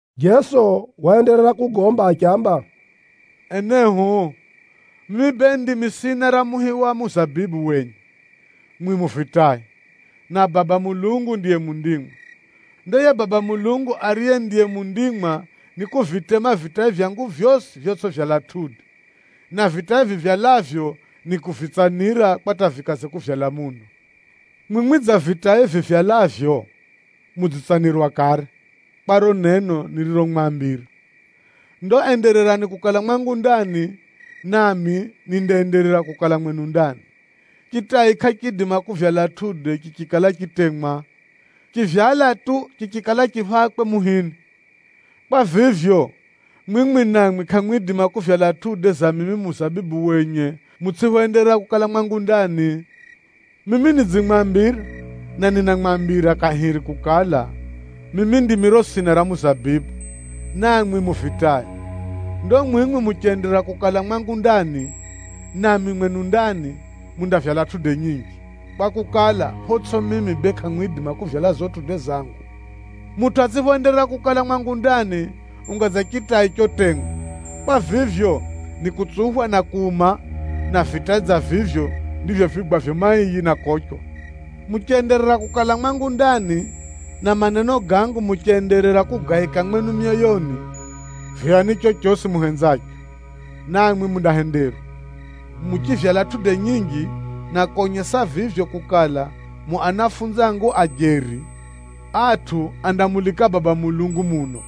Jeso waenderera kugomba achiamba, “Enehu, mimi bee ndimi sina ra muhi wa muzabibu wenye, mwimwi mu vitai, na Baba Mulungu ndiye mundimwa. Ndo yiye Baba Mulungu ariye ndiye mundimwa nikuvitema vitai vyangu vyosi vyotsʼivyala matunda, na vitai vivyalavyo, nikuvitsanira, kwa hata vikaze kuvyala muno. Mwimwi dza vitai vivyalavyo, mudzitsanirwa kare, kwa riro neno niriromwambira. Ndo endererani kukala mwangu ndani, nami nindaenderera kukala mwenu ndani. Chitai kʼachiidima kuvyala matunda chichikala chitemwa. Chivyala tu, chichikala chi phakwe muhini. Kwa vivyo, mwimwi namwi kʼamwidima kuvyala matunda ga mimi muzabibu wenye mutsʼiphoenderera kukala mwangu ndani. “Mimi nidzimwambira, na ninamwambira kahiri kukala, mimi ndimi riro sina ra muzabibu, namwi mu vitai. Ndo mwimwi muchenderera kukala mwangu ndani, nami mwenu ndani, mundavyala matunda manji, kwakukala, photsʼi mimi bee kʼamwidima kuvyala gago matunda gangu. Mutʼu atsʼiphoenderera kukala mwangu ndani, unga dza chitai chotemwa. Kwa vivyo, nikutsuphwa na kuuma. Na vitai dza vivyo ndivyo vipigwavyo maiyi na kochwa. Muchenderera kukala mwangu ndani, na maneno gangu muchenderera kugaika mwenu myoyoni, voyani chochosi muhenzacho, namwi mundahenderwa. Muchivyala matunda manji, na konyesa vivyo kukala mu anafunzi angu a jeri, atʼu andamulika Baba Mulungu muno.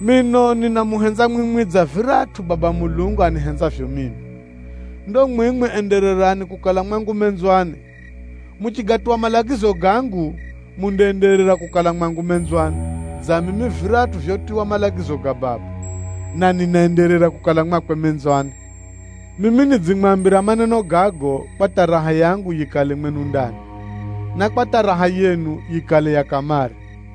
Mino ninamuhenza mwimwi dza viratʼu Baba Mulungu anihenzavyo mimi. Ndo mwimwi endererani kukala mwangu menzwani. Muchigatuwa malagizo gangu, mundaenderera kukala mwangu menzwani, dza mimi viratʼu vyotuwa malagizo ga Baba, na ninaenderera kukala mwakwe menzwani. Mimi nidzimwambira maneno gago, kwa hata raha yangu yikale mwenu ndani, na kwa hata raha yenu yikale ya kamare.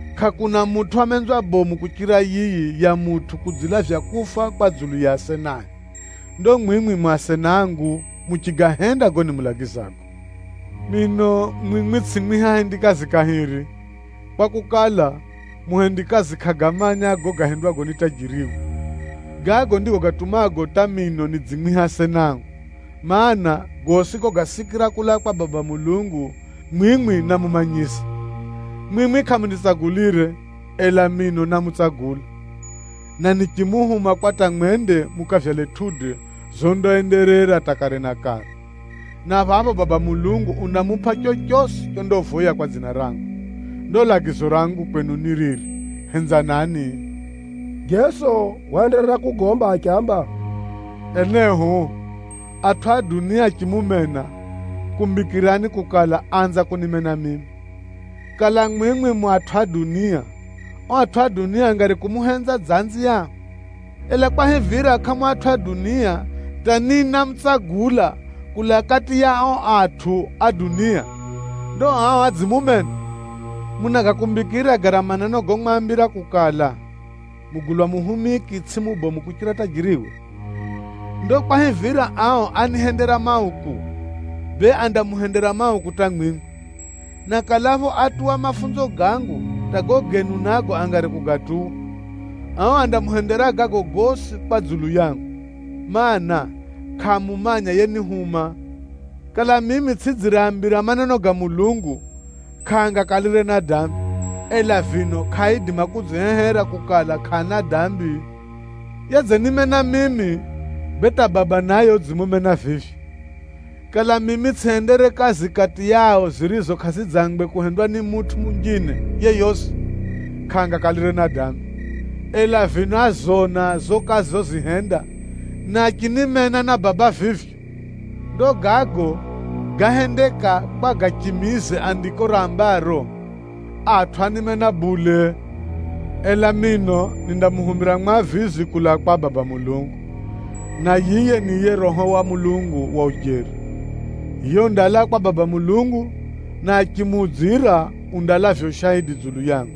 Kʼakuna mutʼu wa menzwa bomu kuchira yiyi ya mutʼu kudzilavya kufa kwa dzulu ya asenae. Ndo mwimwi mu asena angu muchigahenda gago nimulagizago. Mino mwimwi tsʼimwiha ahendikazi kahiri, kwakukala, muhendikazi kʼagamanya gago gahendwago ni tajiriwe. Gago ndigo gatumago hata mino nidzimwiha asena angu, mana, gosi gogasikira kulaa kwa Baba Mulungu, mwimwi námumanyisa. Mwimwi kʼamunitsagulire, ela mino námutsagula, na nichimuhuma kwa hata mwende mukavyale matunda gondaenderera hata kare na kare, na phapho Baba Mulungu undamupʼa chochosi chondavoya kwa dzina rangu. Ndo lagizo rangu kwenu ni riri: henzanani.” Jeso waenderera kugomba achiamba, “Enehu, atʼu a dunia achimumena, kumbikirani kukala, áanza kunimena mimi. Kala mwimwi mu atʼu a dunia, ao atʼu a dunia angari kumuhenza dza anziao. Ela kwahivira kʼamu atʼu a dunia, hata ni námutsagula kulaa kati ya ao atʼu a dunia, ndo ao adzimumena. Munagakumbikira gara maneno gomwambira kukala, ‘Mugulwa muhumiki tsʼiye mubomu kuchira tajiriwe’? Ndo kwahivira ao ánihendera mauku, bee andamuhendera mauku hata mwimwi. Na kalapho átuwa mafunzo gangu, hata gago genu nago angari kugatuwa. Ao andamuhendera gago gosi kwa dzulu yangu, mana, kʼaamumanya yenihuma. Kala mimi tsʼidzireaambira maneno ga Mulungu, kʼaangakalire na dambi, ela vino kʼaaidima kudzihehera kukala, kʼaana dambi. Yedzenimena mimi, bee hata Baba naye udzimumena vivyo. Kala mimi tsʼihendere kazi kati yao zirizo kʼazidzangwe kuhendwa ni mutʼu munjine yeyosi, kʼaangakalire na dambi. Ela vino ázona zo kazi zozihenda, na achinimena na Baba vivyo. Ndo gago gáhendeka kwa gachimize Andiko rambaro, ‘Atʼu ánimena bule!’ “Ela mino nindamuhumira Mwavizi kulaa kwa Baba Mulungu, na yiye ni yiye Roho wa Mulungu wa ujeri. Yiye undalaa kwa Baba Mulungu, na achimuudzira undalavya ushaidi dzulu yangu.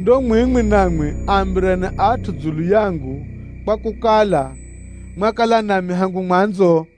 Ndo mwimwi namwi aambireni atʼu dzulu yangu kwakukala, mwakala nami hangu mwanzo.